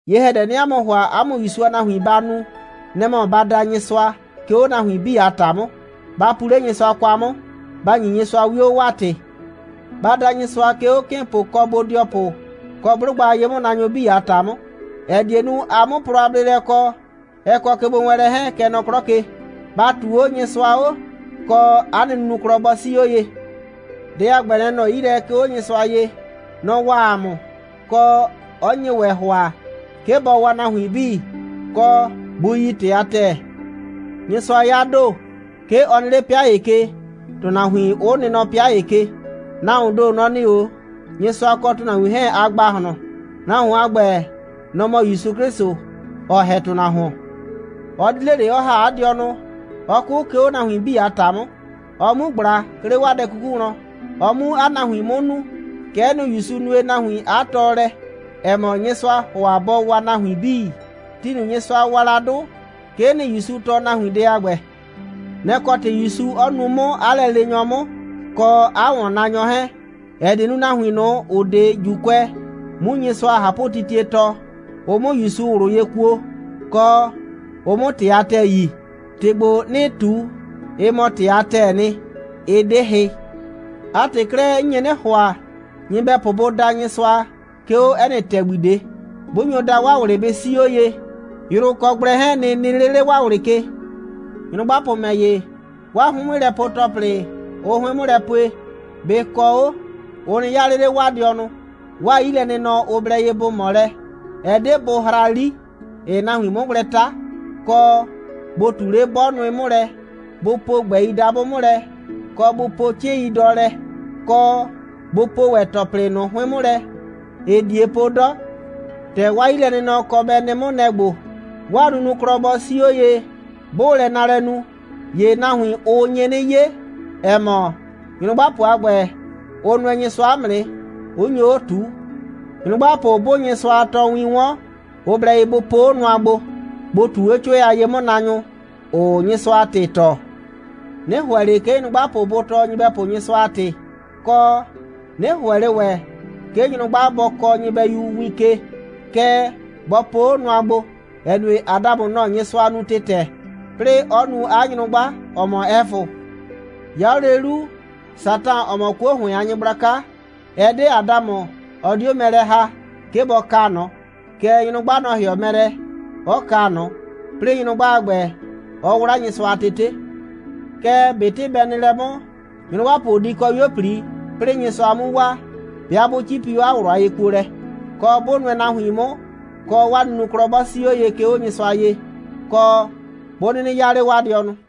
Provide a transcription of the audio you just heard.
Ye‑hɛdɛ, 'nɩɩ 'a mʋ ‑hʋa, 'a mʋ ‑Yusu a nahuin ba nu, nɛ‑ mɔ ba da Nyɩsʋa, 'ke 'o nahuin 'bii a ‑ta 'mʋ, ba pu 'le Nyɩsʋa kwa 'mʋ, ba ‑nyi Nyɩsʋa 'wio, 'waa ‑tɩ. Ba da Nyɩsʋa, 'ke 'o 'kɩɩnpʋ kɔ bodɩɔpʋ kɔ 'blʋgba a ye'mʋnaanyʋ 'bii a ‑ta 'mʋ, ‑ɛ die nu, ‑a 'mʋ plɔ a bleelɛ kɔ, ɛ kɔ kegbowɛɛnlɛ 'hɛɛn, kɛ nɔ 'klɔ ke. ‑Ba ꞊tuu 'o Nyɩsʋa 'o, kɔ, ‑a nɩ nunuklɔ bɔ 'sii 'o ye. Dɛ a ‑gbɛ, nɛ‑ nɔ 'yi lɛ, 'ke 'o Nyɩsʋa ye. Nɔ‑ waa ‑a mʋ, kɔ, 'ɔ nye ‑wɛ ‑hʋa, 'ke bɔ waa nahuin 'bii, kɔ, bʋ yi ‑tɩ a ‑tɛɛ. Nyɩsʋa 'ya ‑do. 'Ke ɔ nɩ 'le 'pɩa ‑ye ke, ‑tʋnahuin 'ʋ nɩ nɔ 'pɩa ‑ye ke. Nahuoon ‑do, nɔ‑ nɩ 'o Nyɩsʋa kɔ ‑tʋnahuin 'hɛɛn a ‑gbahlɔn. Nahuon a ‑gbɛ, nɔ‑ mɔ ‑Yusu 'Klɩsʋ, ‑ɔ ‑hɛ ‑tʋnahuon. Ɔ di 'le ꞊le, 'ɔ ‑ha 'a dɩɔnʋ, 'ɔ 'kʋ, 'ke 'o nahuin 'bii a ‑ta 'mʋ, ɔ 'mu ꞊gbla, 'ke 'le 'waa dɛ 'kuku wlɔn, ɔ 'mu 'a nahuin 'mʋ nuu. Kɛ'ɛ nɩ, ‑Yusu nue nahuin 'a tɔɔlɛ, ‑ɛ mɔ, Nyɩsʋaa ‑hʋa bɔ waa nahuin 'bii. Ti ꞊nʋ, Nyɩsʋa wa la 'dʋ, 'kee nɩ, ‑Yusu tɔɔ nahuin dɛ a ‑gbɛ. Nɛ‑ kɔ ‑tɩ ‑Yusu 'ɔ nuu 'mʋ 'a lɛleenyɔ 'mʋ, kɔ 'a ‑wɔnnaanyɔ 'hɛɛn, ‑ɛ die nu, nahuin ꞊nʋ, ‑ʋ 'de ‑Juukʋɛ, 'mu Nyɩsʋa a ꞊hapʋtitie tɔɔ, ʋ 'mʋ ‑Yusu ꞊wlʋ ye kuo, kɔ, ʋ 'mʋ ‑tɩ a ‑tɛɛ yi. ‑Tɩ ‑gbo, 'nɩɩ ꞊tu, ɩ mɔ ‑tɩ a ‑tɛɛ nɩ, ɩ 'de hɩ. 'A ‑tɩ 'klɛɛ, 'n nye 'nɩ ‑hʋa, nyɩbɛpʋ bʋ da Nyɩsʋa, 'ke 'o 'ɛ nɩ ‑tɛgbi ꞊de. 'Bʋ nyo da, 'waa ꞊wlɩ bɩ 'sii 'o ye, yrʋ kɔ gblɛ 'hɛɛn nɩ nɩ 'le 'le 'waa ꞊wlɩ ke. Nyrʋgbapʋ ‑mɛ ‑ye, 'waa 'hʋɩn'mʋlɛpue‑tɔplɩ, ʋʋ 'hʋɩn 'mʋ lɛ pue, bɩ kɔ 'o, ʋ nɩ 'yaa 'le 'le 'waa dɩɔnʋ. 'Waa 'yilɛnɩnɔ, ʋ blɛ ye bʋ ꞊mɔ lɛ, ɛ 'de bʋ hra 'li, ‑ɩɩ nahuin 'mʋ gblɛ 'ta, kɔ, bʋ ꞊tu 'le 'bɔ nʋɩ 'mʋ lɛ, bʋ po ꞊gbɛi dabʋ 'mʋ lɛ, kɔ, bʋ po 'cɩɩn.i dɔ lɛ, kɔ, bʋ po ‑wɛ ‑tɔplɩ ꞊nʋ 'hʋɩn 'mʋ lɛ, ‑ɩɩ ꞊die po 'dɔ. ‑Tɛ 'waa 'yilɛnɩnɔ kɔ bɛ nɩ 'mʋ, nɛ‑ ‑gbo: 'Waa nunuklɔ bɔ 'sii 'o ye. 'Bʋʋ lɛ naalɛ nu, ‑ye nahuin, ʋ nye 'nɩ 'ye, ‑ɛ mɔ, nyrʋgbapʋ a ‑gbɛ, ʋ nʋɛ Nyɩsʋa 'mʋ nɩ, 'ʋ nyo 'o ꞊tuu. Nyrʋgbapʋ 'bʋʋ Nyɩsʋa a tɔɔwin 'wɔn, ʋ blɛ ye bʋ po 'o nʋa gbo, bʋ ꞊tuu 'o 'cʋɛ a ye'mʋnaanyʋ ꞊nʋ, ‑ʋʋ Nyɩsʋa a ‑tɩ tɔɔ. 'Nɩ ‑hʋɛ ꞊le, 'ke nyrʋgba bɔ tɔɔ nyɩbɛyu Nyɩsʋa a ‑tɩ, kɔ, 'nɩ ‑hʋɛ ꞊le ‑wɛ, 'ke nyrʋgba bɔ kɔɔ nyɩbɛyu win ke, kɛɛ, bɔ po 'o nʋa gbo, ‑ɛ nue, Adamʋ, nɔ‑ Nyɩsʋa nu ‑tɩtɛ, 'plɩɩ 'ɔ nu 'a nyrʋgba, ‑ɔ mɔ Ɛfʋ. 'Ya 'o lele 'lu, Satan, ‑ɔ mɔ 'kuo ‑hʋɩn a nyɩgblaka, ɛ 'de Adamʋ, ɔ 'dio mɛ lɛ ‑ha, 'ke bɔ kaa ꞊nɔ, kɛɛ, nyrʋgba, nɔ‑ ‑hɩɔ mɛ lɛ, 'ɔ kaa ꞊nɔ, 'plɩɩ nyrʋgba a ‑gbɛ, 'ɔ 'wla Nyɩsʋa a tete. Kɛɛ, ꞊betɩ bɛ nɩ lɛ 'mʋ, nyrʋgbapʋ di kɔ 'yuo꞊pli, 'plɩɩ Nyɩsʋa 'mu waa, 'bɩa 'bʋ 'cipi 'o 'a ꞊wlʋ a yekuolɛ, kɔ, 'bʋ nʋɛ nahuin 'mʋ, kɔ, 'waa nunuklɔ 'bɔ 'sii 'o ye, 'ke 'o Nyɩsʋa ye, kɔ, 'bʋ 'nɩnɩ 'yaa 'le 'waa dɩɔnʋ.